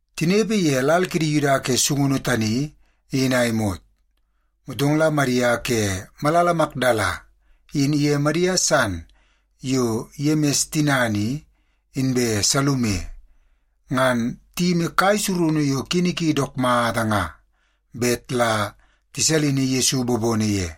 Tinepe ye lal kidi Yuda ke sungunu tani in a imot, motong la Madia ke malala Makdala in iye Madia san yo Yemis tinana i, inbe Salume, ngan tiyimi kai surunu yo kini ki dook mata nga bet la tisalini Yesu bobono ye.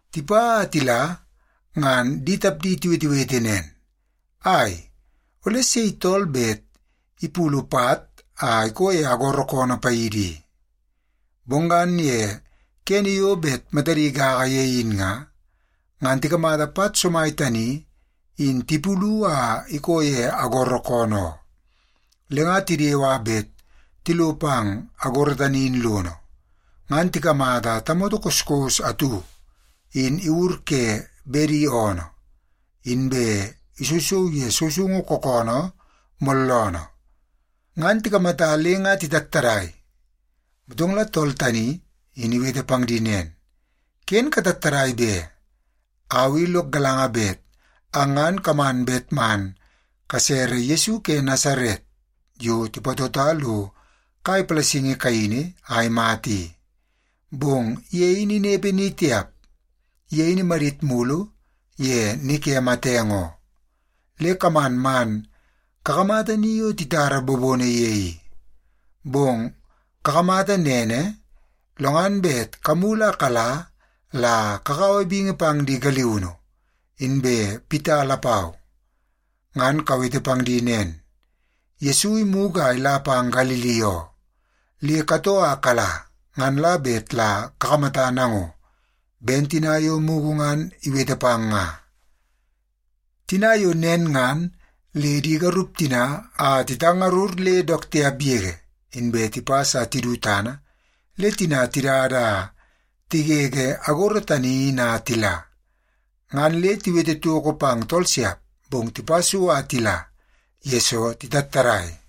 Tipa a tila ngan di tapdi tiwetewete nen, “Ai, ole sei tool bet ipulu pat a ikoo ye agoro koonoo paidi i?” Bong ngan ye kene yo bet matadi gaga ye in nga, ngan tikamata pat somai tani in tipulu a ikoo ye agoro koonoo oo. Le nga tidewe a bet tilo pang agoro tani in lono, ngan tikamata tamoto koskos atu in iwur ke bedi oonoo. Inbe isousou ye sousoungu kookoonoo mooloonoo. Ngan tikamata le nga titattadai. Motong la tool tani in iwete pang di nen, “Ken katattadai be! Au i lok galanga bet ang ngan kaman bet man kasere Yesu ke Nasaret yo tipatota lo kai palasingi kaini a imata i. Bong ye in inepe ni tiap. Ye in imadit mulu ye ni ke matenge oo. Le kaman man kakamata ni yo titara bobono ye i. Bong kakamata nene, lo ngan bet kamulu a kala la kakaua bingi pang di galiunu, inbe Pita lapau. Ngan kawete pang di nen, ‘Yesu imugu a ila pang Galili oo. Le katoo a kala ngan la bet la kakamata nango, ben tina yo mugu ngan iwete pang nga.’” Tina yo ngan le di garup tina ngan titattadai a titangarur le dook tiap yege, inbe tipas a tidu tana le tina tidada a tigege agoro tani in a tila. Ngan le tiwete toko pang tool siap, bong tipa so a tila, yesoo titattadai.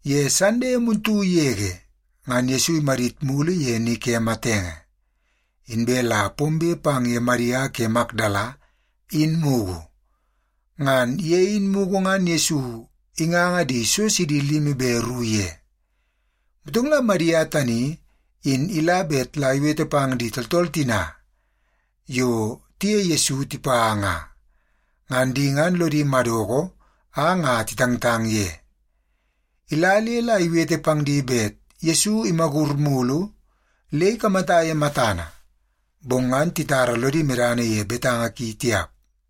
Ye Sande muntu yege ngan Yesu imadit mulu ye ni ke matenge, inbe la pombe pang ye Madia ke Makdala in mugu. Ngan ye in mugu ngan Yesu inganga di so sidi limi be ru ye. Motong la Madia tani in ila bet la iwete pang di tooltool tina yo tiye Yesu tipa nga. Ngan di ngan lodi madoko a nga titangtang ye. Ila le la iwete pang di bet Yesu imagur mulu le ikamata ye matana, bong ngan titara lodi medana ye betanga ki tiap.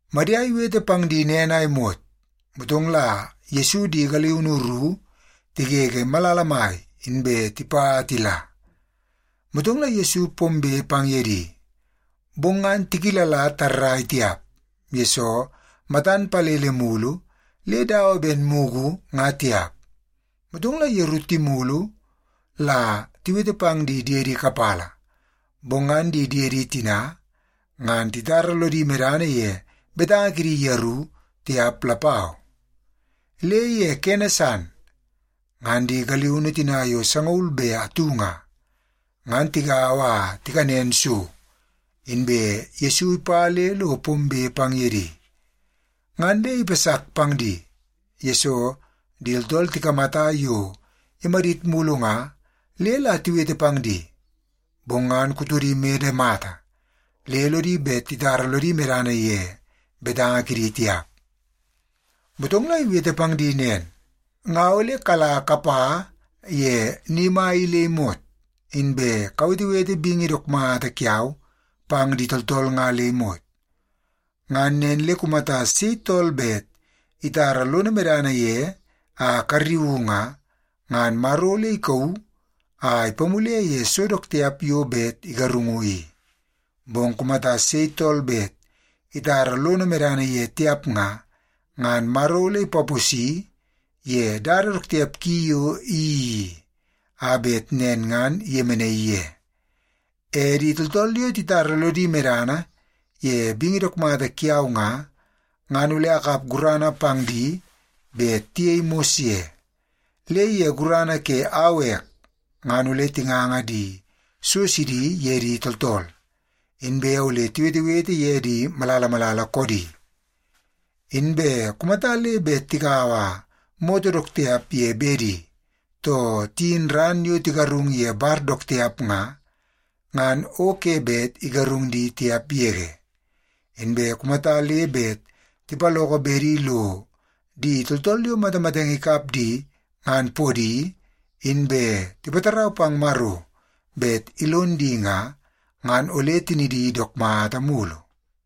Madia iwete pang di nen a imot, motong la Yesu di galiunu ru tigege malala mai inbe tipa a tila, motong la Yesu pombe pang ye di. Bong ngan tikilala tarrai tiap, yesoo matan palele mulu le dawa ben mugu nga tiap. Motong la yeru timulu la tiwete pang di diedi kapala, bong ngan di diedi tina ngan titara lodi medana ye betanga kidi yeru tiap lapau. Le ye kene san, ngan di galiunu tina yo sangaul be atu nga, ngan tigaua a tikanen so, inbe Yesu ipa le lo pombe pang ye di. Ngan le ipasak pang di, yesoo di tooltool tikamata yo imadit mulu nga le la tiwete pang di, bong ngan kutodi imede mata le lodi bet titara lodi medana ye betanga kidi tiap. Motong la iwete pang di nen, “Nga ole kala kapa ye ni mai i le imot, inbe kawetewete bingi dook mata kiau pang di tooltool nga le imot. Ngan nen le kumata sei tool bet itara lono medana ye a karriuu nga, ngan Maro ole ikauu a ipamule ye so dook tiap yo bet igarungu i. Bong kumata sei tool bet itara lono medana ye tiap nga, ngan Maro ole ipaposi ye dada dook tiap ki yo iyeii i, a bet nen ngan iyemenaii ye. E di tooltool yo titara lodi medana ye bingi dook mata kiau nga, ngan ole akap gurana pang di bet tiyei mos ye. Le ye gurana ke au ek, ngan ole tinganga di so sidi ye di tooltool, inbe ole tiwetewete ye di malala malala koodi. Inbe kumata le bet tikaua moto dook tiap ye bedi, too tiyin ran yo tigarung ye bar dook tiap nga, ngan o ke bet igarung di tiap yege. Inbe kumata le bet tipaloko bedi lo di tooltool yo matamatenge ikap di ngan podi, inbe tipatarau pang Maro bet ilon di nga, ngan ole tinidi dook mata mulu.”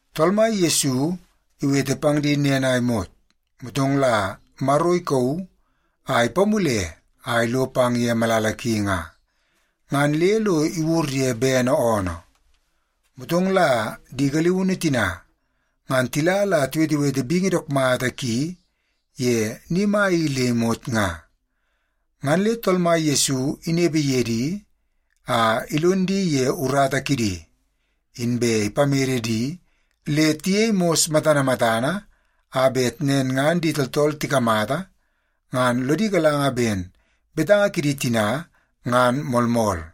Tool Mai Yesu iwete pang di nen a imot, motong la Maro ikauu a ipamule a ilo pang ye malala ki nga, ngan le lo iwur ye bene oonoo. Motong la di galiunu tina ngan tila la tiwetewete bingi dook mata ki ye ni mai i le imot nga. Ngan le Tool Mai Yesu inepe ye di a ilon di ye urata kidi, inbe ipamede di le tiyei mos matana matana a bet nen ngan di tooltool tikamata ngan lodi galanga ben betanga kidi tina ngan moolmool.